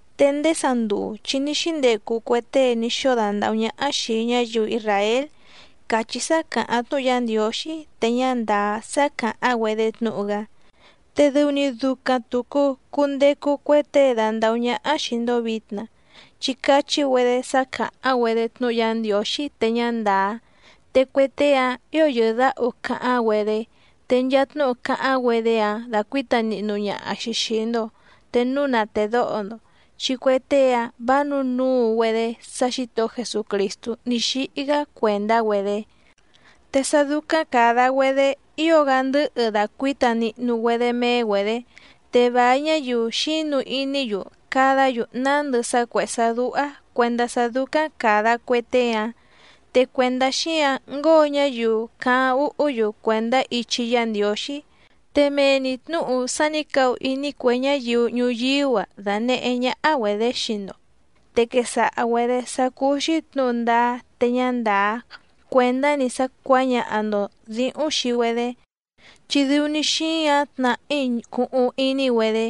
Te ndéé sanduu chi ní xíndecu cue tée ní xóo dandàhú ñáhá xìi ñáyiu isràél càchí sá càháⁿ tnúhu Yá Ndiǒxí te ñá ndàá sá càháⁿ‑güedé tnúhu‑gá, te dɨu‑ni ducaⁿ tùcu cundecu cue tée dandàhú ñáhá xìi‑ndo vitna, chi cachí‑güedé sá càháⁿ‑güedé tnúhu Yá Ndiǒxí te ñá ndàá. Te cue tée‑áⁿ ǐo yɨ̀dáhu cáháⁿ‑güedé, te nchaa tnúhu cáháⁿ‑güedé‑áⁿ dacuǐta nihnu ñaha‑xi xìi‑ndo te núu na tèdóho‑ndo, chi cue tée‑áⁿ vǎ nǔnuu‑güedé sá Xǐtohó Jesucrìstú ní xíhí‑gá cuèndá‑güedé. Te sá dúcáⁿ càda‑güedé ío‑gá ndɨ̌hɨ dacuǐta nihnu‑güedé méé‑güedě. Te vài ñáyiu xínu iní‑yu cadá‑yu nándɨ sá cuèhé sá dúhá cuèndá sá dúcáⁿ càda cue tée‑áⁿ, te cuèndá xíǎⁿ ngóo ñáyiu cáháⁿ úhú‑yu cuèndá ichi Yá Ndiǒxí. Te mee‑ni tnǔhu sá nǐ cahu iní cue ñáyiu ñuyíú‑a danèhé ñáhá‑güedě xii‑ndo, te quesaha‑güedě sá cúú‑xí tnǔhu ndáá te ñá ndàá cuèndá‑ni sá cuǎñaha‑ndo dǐhúⁿ xii‑güedé, chi dɨu‑ni xíǎⁿ tnàhí cuhuⁿ iní‑güedé,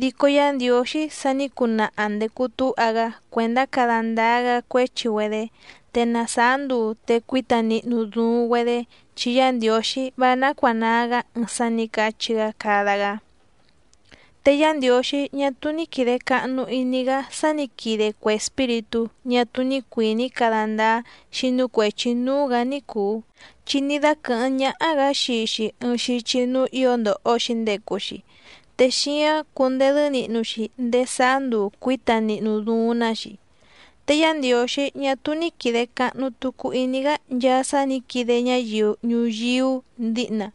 dico Yá Ndiǒxí sa ní cunaha ndècu túha‑gá cuèndá cada ndáá‑gá cuéchi‑güedé, te na sàá nduu te cuíta nihnu duuⁿ‑güedé, chi Yá Ndiǒxí vá nácuànaa‑gá ɨɨⁿ sá nǐ cachí‑gá cada‑gá. Te Yá Ndiǒxí ñá túú ní quìde cahnu iní‑gá sá nǐ quide cue espíritú ñá túú ní cuìní cada ndáá xínú cuèchi núú‑gǎ ní cùu, chi ní dáquɨ̀hɨ́ⁿ ñáhá‑gǎ xii‑xi ɨɨⁿ xichi núú ǐo ndòho‑xi ndecu‑xi, te xíáⁿ cundedɨ́ nihnu‑xi ndéé sáá nduu cuǐta nihnu duuⁿ‑ná‑xi. Te Yá Ndiǒxí ñá túú ní quìde cahnu tucu iní‑gá nchaa sá nǐ quide ñáyiu ñuyíú dǐhna,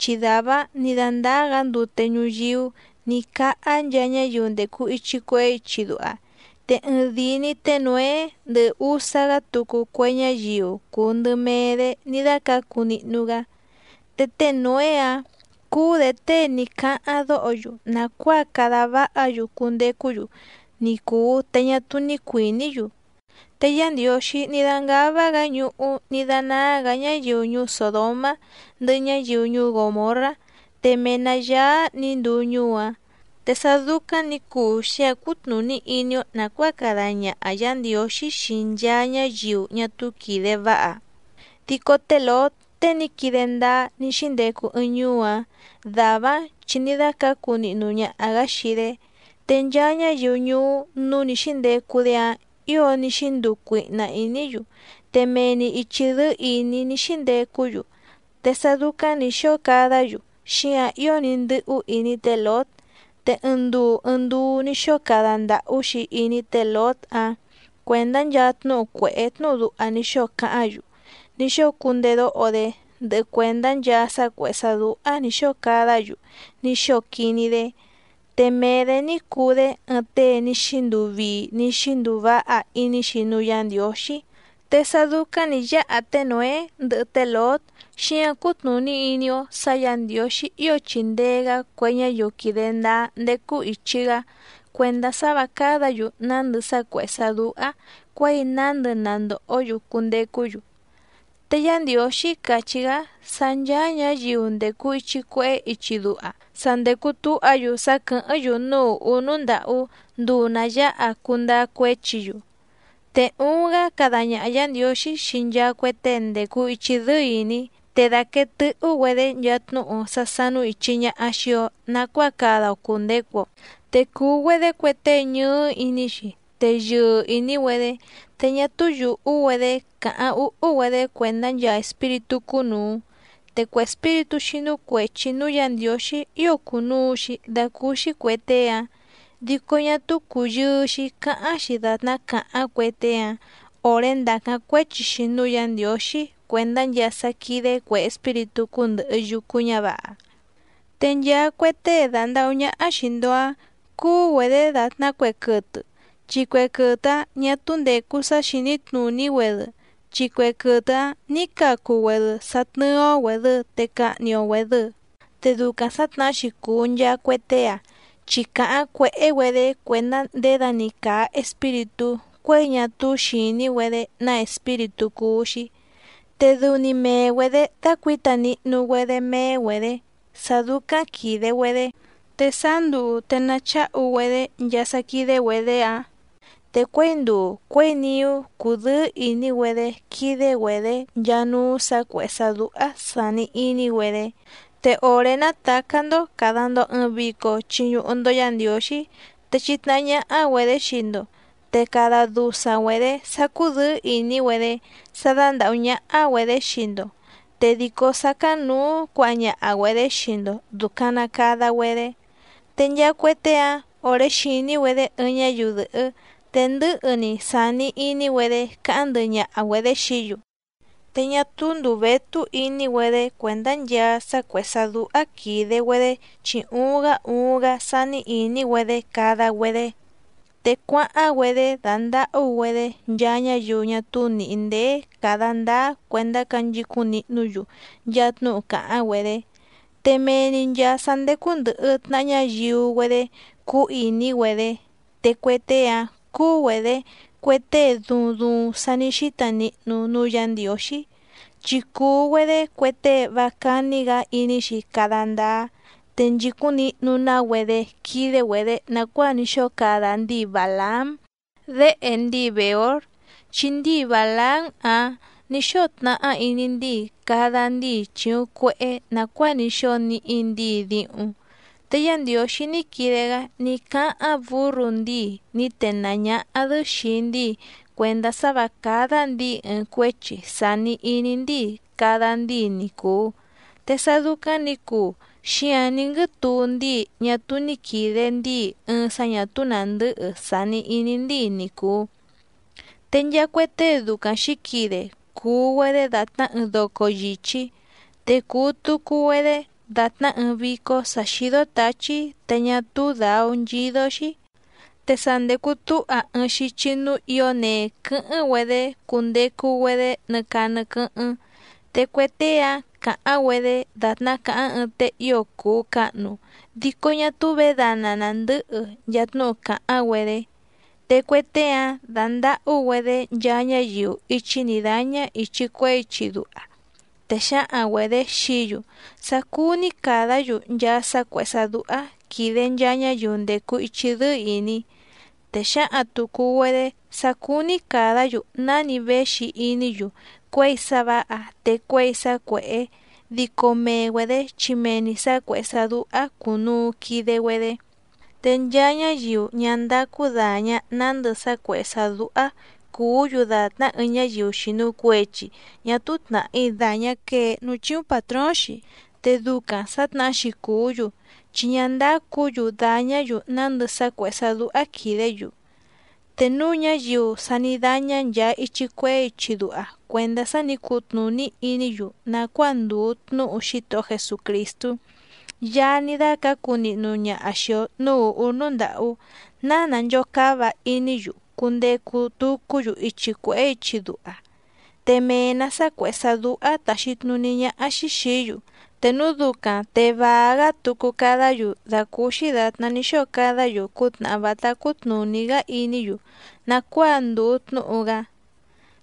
chi dàvá‑áⁿ nǐ dándáá‑gǎ ndute ñuyíú nǐ cáhá nchaa ñáyiu ndècu ichi cuehé ichi duha te ɨɨⁿdìi‑ni té Nǒé ndɨhɨ úsá‑gá tucu cue ñáyiu cùu ndɨ mee‑dé ní dácǎcu nihnu‑gá. Te té Nǒé‑ǎⁿ cúú‑dě tée ní cáháⁿ dóho‑yu nàcuáa cada váha‑yu cundecú‑yu ni cùu te ñá túú ní cuìní‑yu. Te Yá Ndiǒxí ní dángává‑gǎ ñuhú ní dánáá‑gǎ ñáyiu ñuú Sòdomá ndɨhɨ ñáyiu ñuú Gòmorrá te mee‑nǎ yáá nǐ nduu ñuú‑áⁿ. Te sá dúcáⁿ nǐ cuu xíǎⁿ cútnùní iní‑ó nàcuáa cada ñaha Yǎ Ndiǒxí xii nchaa ñáyiu ñá túú quìde váha. Dico té Lǒt tée ní quide ndáá ní xíndecu ɨɨⁿ ñuú‑áⁿ dàvá‑áⁿ chi ní dácǎcu nihnu ñaha‑gǎ xii‑dé. Te nchaa ñáyiu ñuú núú nǐ xíndecu‑dé‑áⁿ ǐo ní xínduu cuihna ìní‑yu, te mee‑ni ìchi dɨ́ɨ́ ìní ní xíndecú‑yu, te sá dúcáⁿ nǐ xóo cadá‑yu xíǎⁿ ío ní ndɨ́hú iní té Lǒt. Te ɨɨⁿ nduu ɨɨⁿ nduu ní xóo cada ndàhú‑xi iní té Lǒt‑áⁿ cuèndá nchaa tnúhu cuèhé tnúhu duha ní xóo cáháⁿ‑yu ní xóo cundedóho‑dé, ndɨhɨ cuèndá nchaa sá cuèhé sá dúhá nǐ xóo cadá‑yu ní xóo quiní‑dé, te mee‑dě ní cuu‑dé ɨɨⁿ tée ní xínduu vii ní xínduu váha iní‑xi núú Yǎ Ndiǒxí. Te sá dúcáⁿ nǐ yáha té Nǒé ndɨhɨ té Lǒt, xíǎⁿ cútnùní iní‑ó sǎ Yǎ Ndiǒxí ío chìndee‑gá cue ñáyiu quìde ndáá ndécú ìchi‑gá cuèndá sá vǎ cádǎ‑yu nándɨ sá cuèhé sá dúhá cuěi nándɨ na ndòhó‑yu cundecú‑yu. Te Yá Ndiǒxí càchí‑gá sá ncháá ñǎyiu ndècu ichi cuehé ichi duha sa ndècu túha‑yu sá quɨ̀hɨ́ⁿ‑yu núú ùhú núú ndàhú nduu nà yáha cundáá cuéchi‑yu. Te uuⁿ‑gá cada ñaha Yǎ Ndiǒxí xii nchaa cue tée ndècu ichi dɨ́ɨ́ ìní, te dàquee tɨ́hú‑güedě nchaa tnúhu sá sánú ìchi ñaha xii‑o nacuáa cada‑o cùndecu‑o, te cùu‑güedé cue tée ñɨɨ́ iní‑xi, te yɨɨ ìní‑güedé, te ñá túú yùhú‑güedé cáháⁿ úhú‑güedé cuèndá nchaa espíritú cúnùu. Te cue espíritú xínú cuèchi núú Yǎ Ndiǒxí ío cùnuu‑xi dacúúxí cuè tée‑áⁿ, dico ñá túú cùyɨɨ‑xi cáháⁿ‑xi dàtná càháⁿ cue tée‑áⁿ òré ndàcáⁿ cuéchi‑xi núú Yǎ Ndiǒxí cuèndá nchaa sá quídé cuè espíritú cúndɨ̀hɨ yucu ñávǎha. Te nchaa cue tée dandàhú ñáhá xìi‑ndo‑áⁿ cúú‑güedě dàtná cue quɨtɨ, chi cue quɨtɨ‑áⁿ ñǎ túú ndècu sá xìní tnùní‑güedɨ, chi cue quɨtɨ‑áⁿ nǐ cacu‑güedɨ sá tnɨ́ɨ́‑ó‑güèdɨ te cahni‑o‑güèdɨ. Te ducaⁿ sǎtnahá‑xi cùu nchaa cue tée‑áⁿ, chi càháⁿ cuèhé‑güedé cuèndá ndědani càa espíritú cuěi ñá túú xìní‑güedé ná espíritú cúú‑xí, te dɨu‑ni mee‑güedě dácuǐta nihnu‑güedé méé‑güedě sá dúcáⁿ quìde‑güedé, te sáá nduu te nacháhu‑güedé nchaa sá quídé‑güedě‑áⁿ, te cuěi nduu cuěi niú cúdɨ̌ɨ́ ìní‑güedé quídé‑güedě nchaa núú sǎ cuèhé sá dúhá sàni iní‑güedé. Te òré nàtacá‑ndó càda‑ndo ɨɨⁿ vico chiñuhu‑ndo Yá Ndiǒxí te chitnahá ñáhá‑güedě xii‑ndo, te cada dusaⁿ‑güedě sá cúdɨ̌ɨ́ ìní‑güedé sá dándàhú ñáhá‑güedě xii‑ndo, te dìcó sácáⁿnǔú cuǎha ñaha‑güedě xii‑ndo dùcaⁿ na cada‑güedé. Te nchaa cue tée‑áⁿ òré xìní‑güedé ɨɨⁿ ñáyiu dɨ̀hɨ́ te ndɨ̌hɨ‑ni sàni iní‑güedé cáháⁿ ndɨhɨ ñaha‑güedě xií‑yu, te ñá túú ndùu vétú iní‑güedé cuèndá nchaa sá cuèhé sá dúhá quìde‑güedé chi uuⁿ‑gá uuⁿ‑gá sání ìní‑güedé cada‑güedé. Te cuáháⁿ‑güedé dándàhú‑güedé nchaa ñáyiu ñá túú nìhí ndéé càda ndáá cuèndá canchicúⁿ nihnú‑yu nchaa tnúhu càháⁿ‑güedé. Te mee‑ni nchàa sá ndécú ndɨ̀hɨ tnaha ñáyiu‑güedé cúú ìní‑güedé, te cue tée‑áⁿ cúú‑güedě cue tée duuⁿ duuⁿ sa ní xíta nihnu núú Yǎ Ndiǒxí. Chi cùu‑güedé cue tée vá cání‑gǎ iní‑xi cada ndáá, te nchìcúⁿ nihnu‑ná‑güedé quídé‑güedě nàcuáa ní xóo cada ndíi Bàlaám déhe ndíi Bèór, chi ndíi Bàlaám‑áⁿ nǐ xóo tnahá iní ndíi cada ndíi chìuⁿ cuehé nàcuáa ní xóo níhí ndǐi díhúⁿ. Te Yá Ndiǒxí ní quide‑gá ní cáháⁿ bǔrru ndíi ní tenàá ñáhá‑dɨ́ xìi ndíi cuèndá sá vǎ cádá ndǐi ɨɨⁿ cuéchi sàni iní ndíi cada ndíi ni cùu. Te sá dúcáⁿ nǐ cuu xíǎⁿ ní nguɨ́tuu ndíi ñá túú ní quìde ndíi ɨɨⁿ sá ñà túú nàndɨ́hɨ sàni iní ndíi ni cùu. Te nchaa cue tée ducaⁿ xǐquide cùu‑güedé dàtná ɨɨⁿ doco yìchí, te cùu tucu‑güedé dàtná ɨɨⁿ vícó sǎ xídó tǎchí te ñá túú dǎú nchídó‑xí, te sa ndècu túha ɨɨⁿ xichi núú ǐo nee quɨ́hɨ́ⁿ‑güedé cundecu‑güedé nɨ caa nɨ quɨ́hɨ́ⁿ. Te cue tée‑áⁿ càháⁿ‑güedé dàtná càháⁿ ɨɨⁿ tée ío cùu cahnu dico ñá túú vědana nàndɨhɨ nchaa tnúhu càháⁿ‑güedé, te cue tée‑áⁿ dándàhú‑güedé nchaa ñáyiu íchí nǐ dáñá ìchi cuehé ichi duha, te xǎhaⁿ‑güedě xií‑yu sá cúú‑ní càdá‑yu nchaa sá cuèhé sá dúhá quìde nchaa ñáyiu ndècu ichi dɨ́ɨ́ ìní, te xǎhaⁿ tùcu‑güedé sá cúú‑ní càdá‑yu náni véxi iní‑yu cuěi sá vǎha te cuěi sá cuèhé, dico mee‑güedě chi mee‑ni sǎ cuèhé sá dúhá cùnuu quide‑güedé. Te nchaa ñáyiu ñá ndácú dàña nándɨ sá cuèhé sá dúhá cùú‑yu dàtná ɨɨⁿ ñáyiu xìnu cuechi ñá túú tnàhí dàñá quee núú chíúⁿ pàtróóⁿ‑xi. Te ducaⁿ sǎtnahá‑xi cùú‑yu chi ñá ndácǔ‑yu dàñá‑yu nándɨ sá cuèhé sá dúhá quìdé‑yu. Te núu ñáyiu sa ní dáñá nchàa ichi cuehé ichi duha cuèndá sá nǐ cutnùní iní‑yu nàcuáa ndùu tnúhu Xítohó Jesucrìstú, Yaá ní dácǎcu nihnu ñaha xìi‑o núú ùhú núú ndàhú ná nànchocáva iní‑yu cundecu tucú‑yu ichi cuèhé ichi duha, te mee‑nǎ sá cuèhé sá dúhá tàxi tnuní ñáhá‑xí xìí‑yu, te núu ducaⁿ te vàa‑gá tucu cadá‑yu dàcúúxí dàtná ní xóo cadá‑yu cútnàhá vátá cútnùní‑gá iní‑yu nàcuáa ndùu tnúhu‑gá.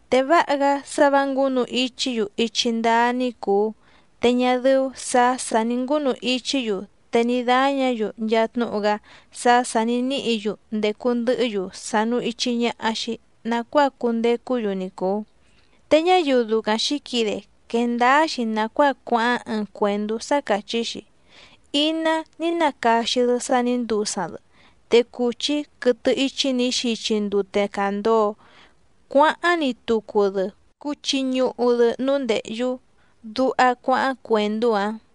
Te váha‑gá sá vǎ ngǔnu ichí‑yu ichi ndáá ní cùu te ñá dɨ́ú sǎ sà ní ngúnu ichí‑yu te ní dáñǎ‑yu nchaa tnúhu‑gá sá sà ní níhǐ‑yu ndècu ndɨhɨ́‑yu sànu ichi ñaha‑xi nacuáa cundecú‑yu ni cùu. Te ñáyiu ducaⁿ xǐquide quèe ndáá‑xi nàcuáa cuáháⁿ ɨɨⁿ cuèndú sá càchí‑xi: “Iná ní nacaxi‑dɨ sá nǐ ndusaⁿ‑dɨ, te cùchí quɨtɨ íchí nǐ xichi ndute càndoo cuáháⁿ‑ni tucu‑dɨ cuchi ñuhu‑dɨ núú ndèhyú”, duha cuáháⁿ cuèndú‑áⁿ.